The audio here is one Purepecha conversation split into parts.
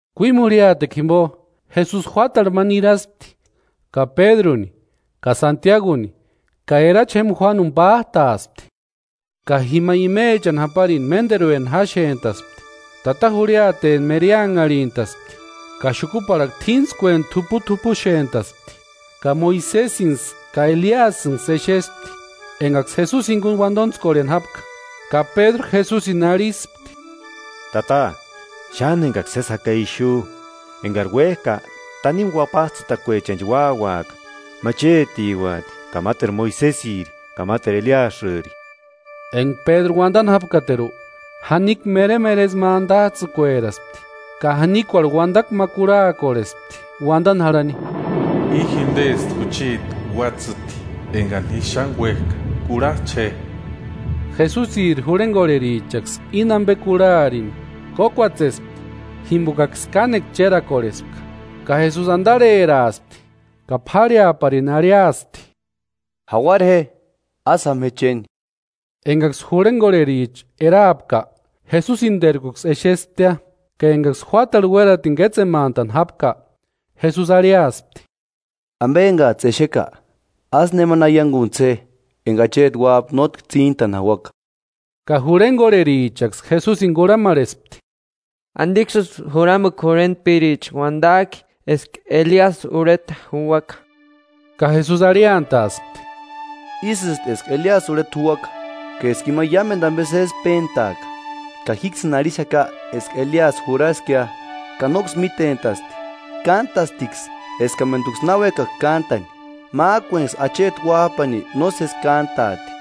Kuímu jurhiatekua jimpo, Jesusi juátarhu ma niraspti ka Pédruni ka Santiaguni ka erachi jémpa Juánuni pát'aaspti. Ka jima imechani japarini ménterueni jáxent'aspti, tata jurhiateni mereanharhint'aspti, ka xukuparhakua t'íntskueni t'uput'upuxent'aspti. Ka Moisesinksï ka Eliasïnksï exespti, enkaksï Jesusini jinkuni uantontskorheni jápka. Ka Pédru Jesusini arhispti: “Tata xáni enkaksï sési jaka ixu, enkari uék'a tanimu uapats'ïtakuechanchi úauaka, ma chétiuati ka máteru Moisesiri ka máteru Eliasïri.” Enka Pédru uantani jápkateru, janikua meremeresï ma antats'ïkueraspti ka janikuarhu uantakua ma kurhaakorhespti uantani jarhani: “I jintesti jucheti Uátsïti enka ji xáni uék'a, kurhach'a je.” Jesusiri jurhenkorherichaksï íni ampe kurharini, kókuatsespti jimpokaksï kánekua chérakorhespka. Ka Jesusi antarheraaspti ka p'árheaparini arhiasti: “Jauara je, ásï jáma je chéni.” Enkaksï jurhenkorhericha eraapka, Jesusiniterkuksï exesptia. Ka enkaksï juátarhu uératini kétsemantani jápka, Jesusi arhiaspti: “Ampe enkats'ï exeka, ásï nemani aiankuntsï je enka Acheti Uáp'a nótki tsíntani jauaka.” Ka jurhenkorherichaksï Jesusini kurhamarhespti: “¿Antiksïsï juramukua jurhentpiricha uantak'i eska Eliasï urheta juuaka?” Ka Jesusi arhiantaaspti: “Ísïsti eska Eliasï urheta juuaka, ka eska ima iámentu ampe sési péntaaka. Ka jíksïni arhixaka eska Eliasï jurhaskia, ka nóksï mítent'asti. Kántastiksï eskamentuksï na uékaka kántani. Mák'uenksï Acheti Uáp'ani nósesi kántaati.”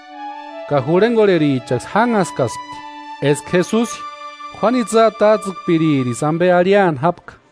Ka jurhenkorherichaksï jánhaskaspti eska Jesusi Juánu itsï atats'ïkpiririsï ampe arhiani jápka.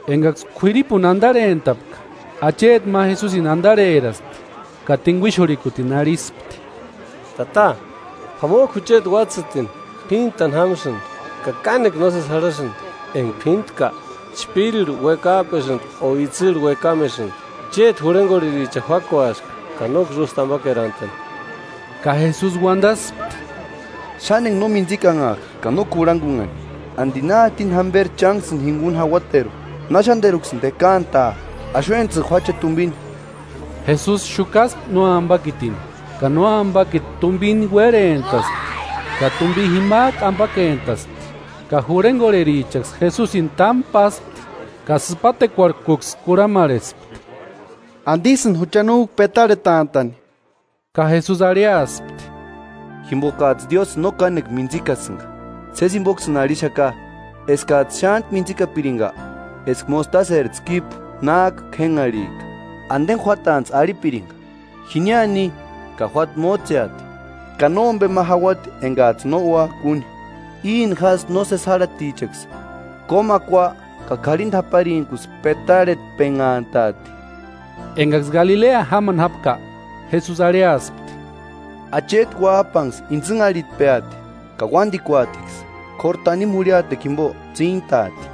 Enkaksï k'uiripuni antarhentapka, acheti ma Jesusini antarheraspti ka tinkuixurhikutini arhispti: “Tata, p'amok'u jucheti uátsïtini, p'íntani jámsïnti, ka kánekua nósesi jarhasïnti, enka p'íntka chpírirhu uékap'esïnti o itsïrhu uékamesïnti. Chéti jurhenkorherichani juákuaska ka nóksï ústi ampakerantani.” Ka Jesusi uantaspti: “¡Xáni enka no mintsikanhak'a ka no kurhankunhani! ¿Anti na jatini jamperi chánksïni jinkuni jauateru? ¿Na xánteruksïni tekaantaa? Axuentsï juáche je tumpini.” Jesusi xukaspti nóampakitini, ka nóampakiti tumpini uérhentaspti ka tumpi jimak'u ampakentaspti. Ka jurhenkorherichaksï Jesusini támu páspti ka sïpatekuarhkuksï kurhamarhespti: “¿Antisïni jucha no u petarhetant'a'ni?” Ka Jesusi arhiaspti: “Jimpokats'ï Diósïni no kánekua mintsikasïnka. Sési jimpoksïni arhixaka, eskats'ï xántku mintsikapirinka eska mostaseri tskípu nák'u k'énharhik'a, anteni juátantsï arhipirinka: ‘Jiniani ni’ ka juáta mótseati, ka nómpe ma jauati enkats'ï no úaka úni. [Íni jásï nósesi járhatichaksï kómakua ka karhinta japarintkusï petarhetpenhantat'i.]” Enkaksï Galilea jámani jápka, Jesusi arhiaspti: “Acheti Uáp'anksï intsïnharhitpeati, ka uántikuatiksï, k'óru tanimu jurhiatekua jimpo tsíntaati.”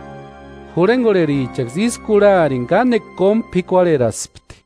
Jurhenkorherichaksï ísï kurharini kánekua kómu p'ikuarheraspti.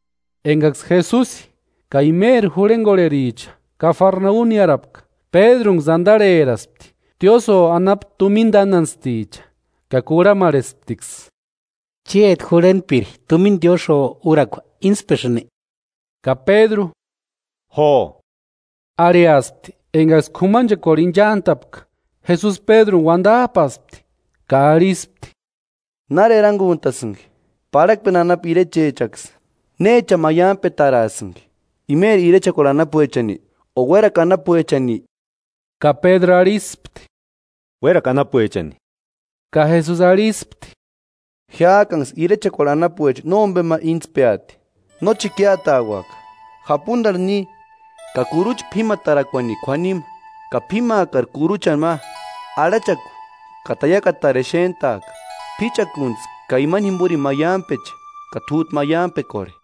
Enkaksï Jesusi ka imeri jurhenkorhericha Kafarnaumi niárapka, Pédrunksï antarheraspti tiósïo anapu tumina tánantsticha ka kurhamarhesptiksï: “¿Chéti jurhentpiri tumina tiósïo úrakua íntspesïnki?” Ka Pédru: “Jo” Arhiaspti. Enkaksï k'umanchekuarhu inchant'apka, Jesusi Pédruni uantap'aspti ka arhispti: “¿Nári erankuntasïnki? Parhakpeni anapu irechechaksï, ¿Néchani maiamperataraasïnki? ¿Imeri irechekuarhu anapuechani o uérakua anapuechani?” Ka Pédru arhispti: “Uérakua anapuechani.” Ka Jesusi arhispti: “Jiák'anksï irechekuarhu anapuecha nómpema íntspeati. Nóchi ikiatauaka, japuntarhu ni ka kurucha p'ímatarakuani k'uanima ka p'ímaakari kuruchani ma, arhachaku ka taiakatari exent'aaka. P'íchakuntsï ka imani jimporini maiampeche ka t'út'u maiampekorhe.”